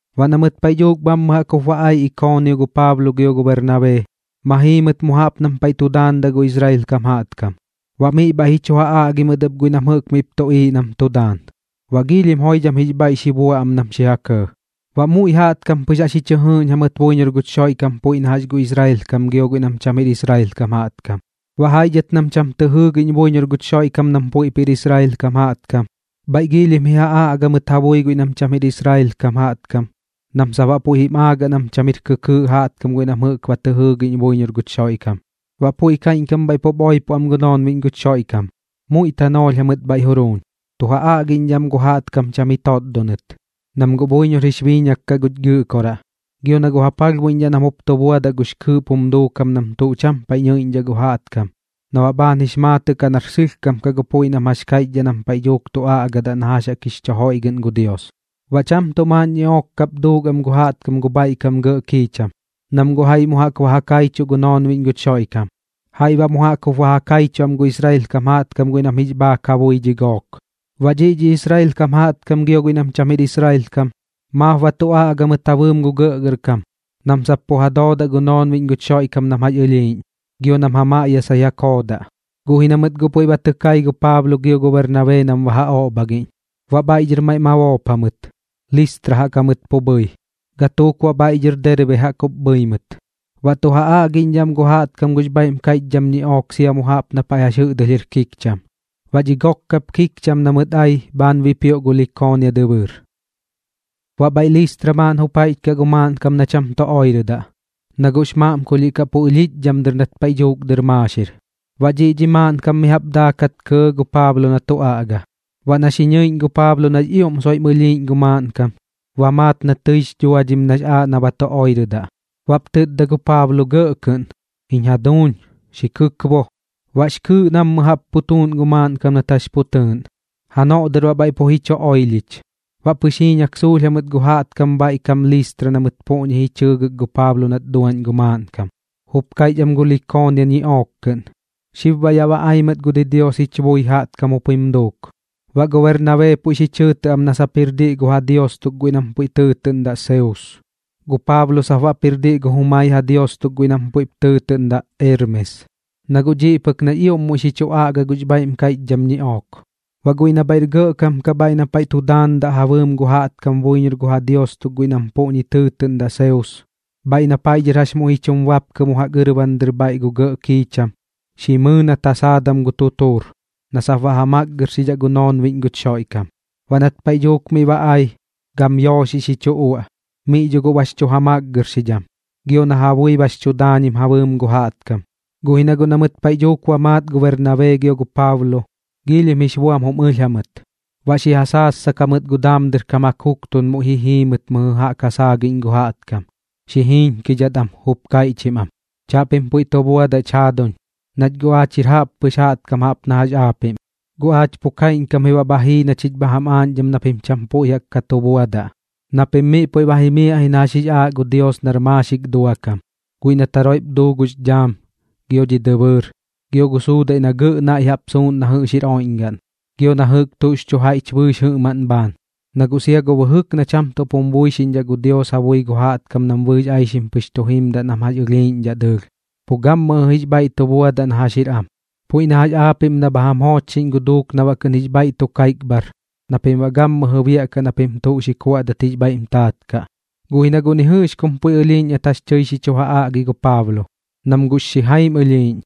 Baꞌ na mɨt paiꞌ dhuuk bhammɨ jaꞌk jup ba ai Ikoonio gu Paablo gio gu Bernabee, ma jii mɨt mu jaꞌp nam paiꞌ tu daandaꞌ gu Israel kam jaꞌtkam, baꞌ miꞌ bhaiꞌ ji chu ja aꞌgi mɨt ɨp guiꞌ nam jɨꞌk miꞌp tuꞌiiꞌ nam tu daan. Baꞌ giilhim joidham jix bhaiꞌ xi bua am nam xi ja kɇɇ, baꞌ muiꞌ jaꞌtkam pɨx jaꞌx ji chɨ jɨɨꞌñ jamɨt buiñor guch Xoiꞌkam puiꞌ na jax gu Israel kam gio guiꞌ nam cham jir Israel kam jaꞌtkam. Baꞌ jaiꞌ dhɨt nam cham tɨ jɨɨgiꞌñ buiñor guch Xoiꞌkam nam puiꞌp jir Israel kam jaꞌtkam, bhaiꞌ giilhim ji ja aꞌga mɨt ja bui guiꞌ nam cham jir Israel kam jaꞌtkam nam sap baꞌ puiꞌ jim aagaꞌ nam cham jir kɨkɨɨꞌ jaꞌtkam guiꞌ nam jɨꞌk ba tɨ jɨɨgiꞌñ buiñor guch Xoiꞌkam. Baꞌ puiꞌ kaiꞌñkam bhaiꞌ pup oipo am gu noonbiꞌñ guch Xoiꞌkam, muiꞌ tanoolh jamɨt bhaiꞌ juruuñ, tu ja aꞌgiꞌñdhaꞌ am gu jaꞌtkam cham ji totdonɨt, nam guꞌ buiñor jix biiñak kaꞌ guch Gɨꞌkoraꞌ, gio na guꞌ ja palhbuiꞌñdhaꞌ nam jup tu buadaꞌ gux kɨɨꞌp jum duukam nam tuꞌ cham paiꞌ nɨiꞌñdhaꞌ gu jaꞌtkam na baꞌ bhaan jix maatɨꞌ kaꞌ nar sɨlhkam kaꞌ gu puiꞌ nam jax kaiꞌchdhaꞌ nam paiꞌ dhuuk tu aꞌgadaꞌ na jax jaꞌk jix chu joiꞌgɨꞌn gu Dios. Baꞌ cham tuꞌ maaꞌn ñiꞌook kap duuk am gu jaꞌtkam gu bhaiꞌ kam gɇꞌ kiicham, nam guꞌ jaiꞌ mu jaꞌk ba ja kaichuꞌ gu noonbiꞌñ guch Xoiꞌkam, jaiꞌ baꞌ mu jaꞌk jup ja kaichuꞌ am gu Israel kam jaꞌtkam guiꞌ nam jix bhaak kaꞌ ja bui dhi gook. Baꞌ dhiꞌ dhi Israel kam jaꞌtkam gio guiꞌ nam cham jir Israel kam maap ba tu aꞌga mɨt ja bɨɨm gu gɇꞌgɇrkam nam sap pu ja doodaꞌ gu noonbiꞌñ guch Xoiꞌkam nam jax ɨlhiiꞌñ, gio nam ja maꞌyasai ja koodaꞌ. Guꞌ ji na mɨt guꞌ puiꞌ ba tɨ kai gu Paablo gio gu Bernabee nam ba ja oꞌbhagiꞌñ, baꞌ bhaiꞌ dhɨr maiꞌ ma boop jamɨt, Listra jaꞌk jamɨt pu bhɨi, gatuuk baꞌ bhaiꞌ dhɨr Derbe jaꞌk jup bhɨi mɨt. Baꞌ tu ja aꞌgidhidhaꞌ am gu jaꞌtkam gux bhaiꞌm kaiꞌchdham ñiꞌook sia mu jaꞌp na paiꞌ jɨꞌdɨlh jir kikcham. Baꞌ dhi gok kap kikcham na mɨt ai bhaan bipioꞌ gu Likoonia dɨbɨɨr. Baꞌ bhaiꞌ Listra maaꞌn jup jaiꞌch kaꞌ gu maaꞌnkam na cham tu oirɨdaꞌ, na guꞌx maꞌmkulhiꞌ kaꞌ pu ɨlhiꞌch dhɨm dɨr nat paiꞌ dhuuk dɨr maaxir. Baꞌ dhiꞌ dhi maaꞌnkam mi jaꞌp daakat kɇɇ gu Paablo na tu aꞌga. Baꞌ na xi ñɨiꞌñ gu Paablo nax ioꞌm soiꞌm ɨlhiiꞌñ gu maaꞌnkam, ba maat na tɨix dhuadhim nax aaꞌ na ba tu oirɨdaꞌ. Baꞌp tɨtda gu Paablo gɇꞌ kɨꞌn: ―¡Jiñ jaduuñ, xi kɨkbo! Baꞌx kɨɨꞌ nammɨ jaꞌp pu tuuꞌn gu maaꞌnkam nat jax pu tɨɨꞌn, janoꞌ dɨr baꞌ bhaiꞌ pu ji chu oilhich. Baꞌ pɨx jiiñak suulh jamɨt gu jaꞌtkam bhaiꞌ kam Listra na mɨt puꞌñi ji chɨɨgɨk gu Paablo nat duaꞌñ gu maaꞌnkam, jup kaiꞌch am gu Likoonia ñiꞌook kɨꞌn: ―Xib baꞌ yaꞌ ba ai mɨt gu didios jich bui jaꞌtkam jup jim duuk. Baꞌ gu Bernabee puiꞌ xi chɨɨtɨꞌ am na sap jir diꞌ gu ja dios tuk guiꞌ nam puiꞌ tɨɨtɨꞌndaꞌ Seus, gu Paablo sap baꞌp jir diꞌ gu jumai ja dios tuk guiꞌ nam puiꞌp tɨɨtɨꞌndaꞌ Eermes, na guꞌ dhiꞌ pɨk nax ioꞌm muiꞌ xi chu aꞌga gux bhaiꞌm kaiꞌchdham ñiꞌook. Baꞌ guiꞌ na bhaiꞌr gɇꞌkam kaꞌ bhaiꞌ na paiꞌ tu daandaꞌ ja bɨɨm gu jaꞌtkam buiñor gu ja dios tuk guiꞌ nam puꞌñi tɨɨtɨꞌndaꞌ Seus, bhaiꞌ na paiꞌ dhɨr jax muiꞌ ji chum bapkɨ mu jaꞌk ɨrban dɨr bhaiꞌ gu gɇꞌ kiicham, xi mɨɨ nat ja saadam gu tutuur, na sap baꞌ ja makgɨrxidhaꞌ gu noonbiꞌñ guch Xoiꞌkam. Baꞌ nat paiꞌ dhuuk miꞌ ba ai, gam yooxiꞌ xi chu uaꞌ. Miꞌ dho guꞌ bax chu ja makgɨrxidham, gio na ja bui bax chu daañim ja bɨɨm gu jaꞌtkam. Guꞌ ji na guꞌ na mɨt paiꞌ dhuuk ba maat gu Bernabee gio gu Paablo, giilhim jix buam jum ɨlh jamɨt, baꞌ xi ja saassak jamɨt gu daam dɨr kam ja kuktun muiꞌ ji jii mɨt mɨjɨ jaꞌp ja saagiꞌñ gu jaꞌtkam, xi jiiñkidhat am jup kaiꞌchim am: ―Chaꞌpim puiꞌ tu buadaꞌch jaaduñ. Nach guꞌ aach jir jaꞌppɨx jaꞌtkam jaꞌp na jax aapiꞌm. Guꞌ aach pu kaiꞌñkam ji baꞌ bha jii na chich bha jam aaꞌñdham na pim cham puiꞌ jaꞌk ka tu buadaꞌ, na pim miꞌ puiꞌ ba jimiaꞌ ji na jax jix aaꞌ gu Dios nar maaxik dua kam guiꞌ nat jaroiꞌp duu gux dhaam, gio dhi dɨbɨɨr, gio gu suudaiꞌ na gɇꞌ naiꞌ suuꞌn na jɨꞌx jir oiꞌñgaꞌn, gio na jɨꞌk tuꞌx chu jaiꞌch bɨɨx jɨꞌmaꞌn bhaan. Na guꞌ sia gu bɨjɨk na cham tuꞌp jum buixiꞌñdhaꞌ gu Dios ja bui gu jaꞌtkam nam bɨɨx aixim pɨx tu jimdaꞌ nam jax ɨlhiiꞌñdhaꞌ dɨɨlh. Pu gammɨjɨ jix bhaiꞌ tu buadaꞌ na jax jir am, puiꞌ na jax aapiꞌm na bha jam joochxiꞌñ gu duuk na baꞌ kɨꞌn jix bhaiꞌ tu kaipbhar na pim baꞌ gammɨjɨ biaꞌkaꞌ na pim tuꞌ xi kuaꞌdat jix bhaiꞌm taat kaꞌ. Guꞌ ji na guꞌ ni jɨꞌx kum puiꞌ ɨlhiiꞌñ nat jax tɨi xi chu ja aꞌgi gu Paablo, nam guꞌx xijaim ɨlhiiꞌñ,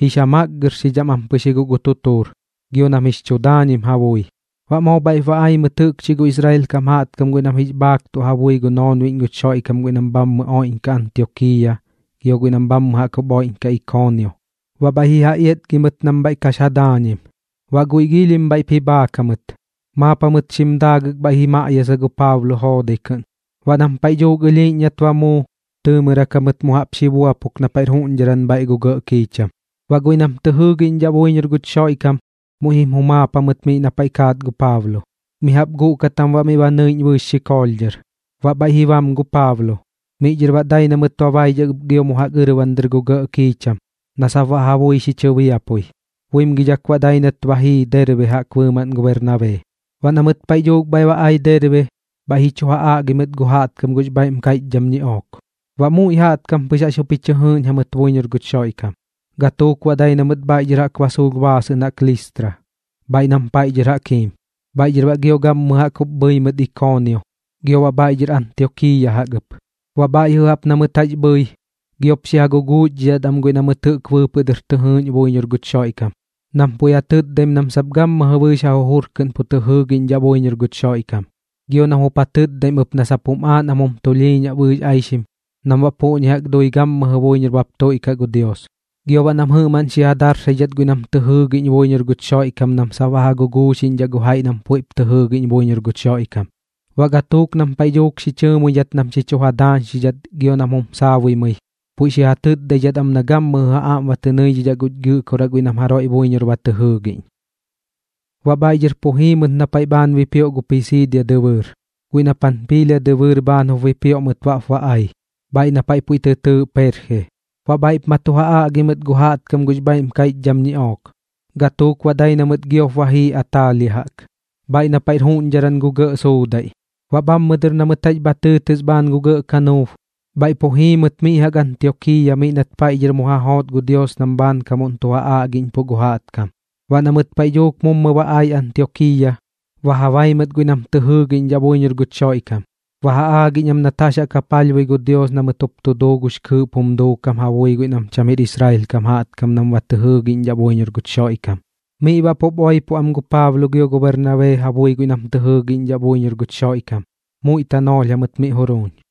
jix ja makgɨrxidham am pɨx ji guꞌ gu tutuur, gio nam jix chu daañim ja bui. Baꞌ moo bhaiꞌp ba ai mɨt jɨꞌkchi gu Israel kam jaꞌtkam guiꞌ nam jix bhaaktuꞌ ja bui gu noonbiꞌñ guch Xoiꞌkam guiꞌ nam bhammɨ oiꞌñkaꞌ Antiokiiya gio guiꞌ nam bhaiꞌ jaꞌk jup oiꞌñkaꞌ Ikoonio, baꞌ bhaiꞌ ji ja iatgi mɨt nam bhaiꞌ kax ja daañim. Baꞌ guiꞌ giilhim bhaiꞌp ji bhaak jamɨt, maap jamɨt xim daagɨk bhaiꞌ ji maꞌyasa gu Paablo joodai kɨꞌn. Baꞌ nam paiꞌ dhuuk ɨlhiiꞌñ nat ba muu, tɨɨmɨrak jamɨt mu jaꞌp xi buapuk na paiꞌr juꞌñdharan bhaiꞌ gu gɇꞌ kiicham. Baꞌ guiꞌ nam tɨ jɨɨgiꞌñdhaꞌ buiñor guch Xoiꞌkam muiꞌ jim jumaap jamɨt miꞌ na paiꞌ kaat gu Paablo. Mi jaꞌp guꞌkat jam baꞌ miꞌ ba nɨiꞌñ bɨɨx xikoolh dhɨr, baꞌ bhaiꞌ ji bam gu Paablo. Miꞌ dhɨr baꞌ dai na mɨt ba baidhak ɨp gio mu jaꞌk ɨrban dɨr gu gɇꞌ kiicham na sap baꞌ ja bui xi chɨbiapui. Buimgidhak baꞌ dai nat ba jii Derbe jaꞌk bɨɨmaꞌn gu Bernabee. Baꞌ na mɨt paiꞌ dhuuk bhaiꞌ ba ai Derbe, bhaiꞌ ji chu ja aꞌgi mɨt gu jaꞌtkam gux bhaiꞌm kaiꞌchdham ñiꞌook. Baꞌ muiꞌ jaꞌtkam pɨx jaꞌx jup ji chɨ jɨɨꞌñ jamɨt buiñor guch Xoiꞌkam. Gatuuk baꞌ dai na mɨt bhaiꞌ dhɨr jaꞌk ba suulh baasɨꞌn jaꞌk Listra, bhaiꞌ nam paiꞌ dhɨr jaꞌk jiim. Bhaiꞌ dhɨr baꞌ gammɨjɨ jaꞌk jup bhɨi mɨt Ikoonio gio baꞌ bhaiꞌ dhɨr Antiokiiya jaꞌk ɨp. Baꞌ bhaiꞌ jɨꞌ jaꞌp na mɨt jax bhɨi, giop xi ja guguuxdhidhat am guiꞌ na mɨt jɨꞌk bɨɨpɨꞌ dɨr tɨ jɨɨꞌñ buiñor guch Xoiꞌkam, nam puiꞌ ja tɨtdaim nam sap gammɨjɨ bɨɨx ja jujur kɨꞌn pu tɨ jɨɨgiꞌñdhaꞌ buiñor guch Xoiꞌkam, gio nam jup ja tɨtdaim ɨp na sap jum aaꞌ nam jum tulhiiñaꞌ bɨɨx aixim nam baꞌ puꞌñi jaꞌk dui gammɨjɨ buiñor baꞌp tuiꞌkaꞌ gu Dios. Gio baꞌ nam jɨꞌmaꞌn xi ja darsaidhat guiꞌ nam tɨ jɨɨgiꞌñ buiñor guch Xoiꞌkam nam sap baꞌ ja guguuxiꞌñdhaꞌ gu jaiꞌ nam puiꞌp tɨ jɨɨgiꞌñ buiñor guch Xoiꞌkam. Baꞌ gatuuk nam paiꞌ dhuuk xi chɨɨmuidhat nam xi chu ja daañxidhat gio nam jum saabuimɨi, puiꞌ xi ja tɨtdaidhat am na gammɨjɨ ja aꞌm tɨ nɨidhidhaꞌ guch Gɨꞌkoraꞌ guiꞌ na mɨt jaroiꞌ buiñor ba tɨ jɨɨꞌñ. Baꞌ bhaiꞌ dhɨr pu jii mɨt na paiꞌ bhaan bipioꞌ gu Pisiidia dɨbɨɨr, guiꞌ na Panpiilia dɨbɨɨr bhaan jup bipioꞌ mɨt baꞌp ba ai, bhaiꞌ na paiꞌ puiꞌ tɨ tɨɨꞌ Perje. Baꞌ bhaiꞌp ma tu ja aꞌgi mɨt gu jaꞌtkam gux bhaiꞌm kaiꞌchdham ñiꞌook. Gatuuk baꞌ dai na mɨt giop ba jii Ataalia jaꞌk, bhaiꞌ na paiꞌr juꞌñdharan gu gɇꞌ suudaiꞌ. Baꞌ bhammɨ dɨr na mɨt jax bha tɨɨtɨs bhaan gu gɇꞌ kanuub, bhaiꞌ pu jii mɨt mi jaꞌk Antiokiiya miꞌ nat paiꞌ dhɨr mu ja joot gu Dios nam bhaankamuꞌn tu ja aꞌgiꞌñpuꞌ gu jaꞌtkam. Baꞌ na mɨt paiꞌ dhuuk mummɨ ba ai Antiokiiya, ba ja bai mɨt guiꞌ nam tɨ jɨɨgiꞌñdhaꞌ buiñor guch Xoiꞌkam, baꞌ ba ja aagiꞌñ am nat jax jaꞌk ja palhbui gu Dios na mɨt jup tu duu gux kɨɨꞌp jum duukam ja bui guiꞌ nam cham jir Israel kam jaꞌtkam nam baꞌ tɨ jɨɨꞌñdhaꞌ buiñor guch Xoiꞌkam. Miꞌ baꞌ pup oipo am gu Paablo gio gu Bernabee ja bui guiꞌ nam tɨ jɨɨgiꞌñdhaꞌ buiñor guch Xoiꞌkam, muiꞌ tanoolh jamɨt miꞌ juruuñ.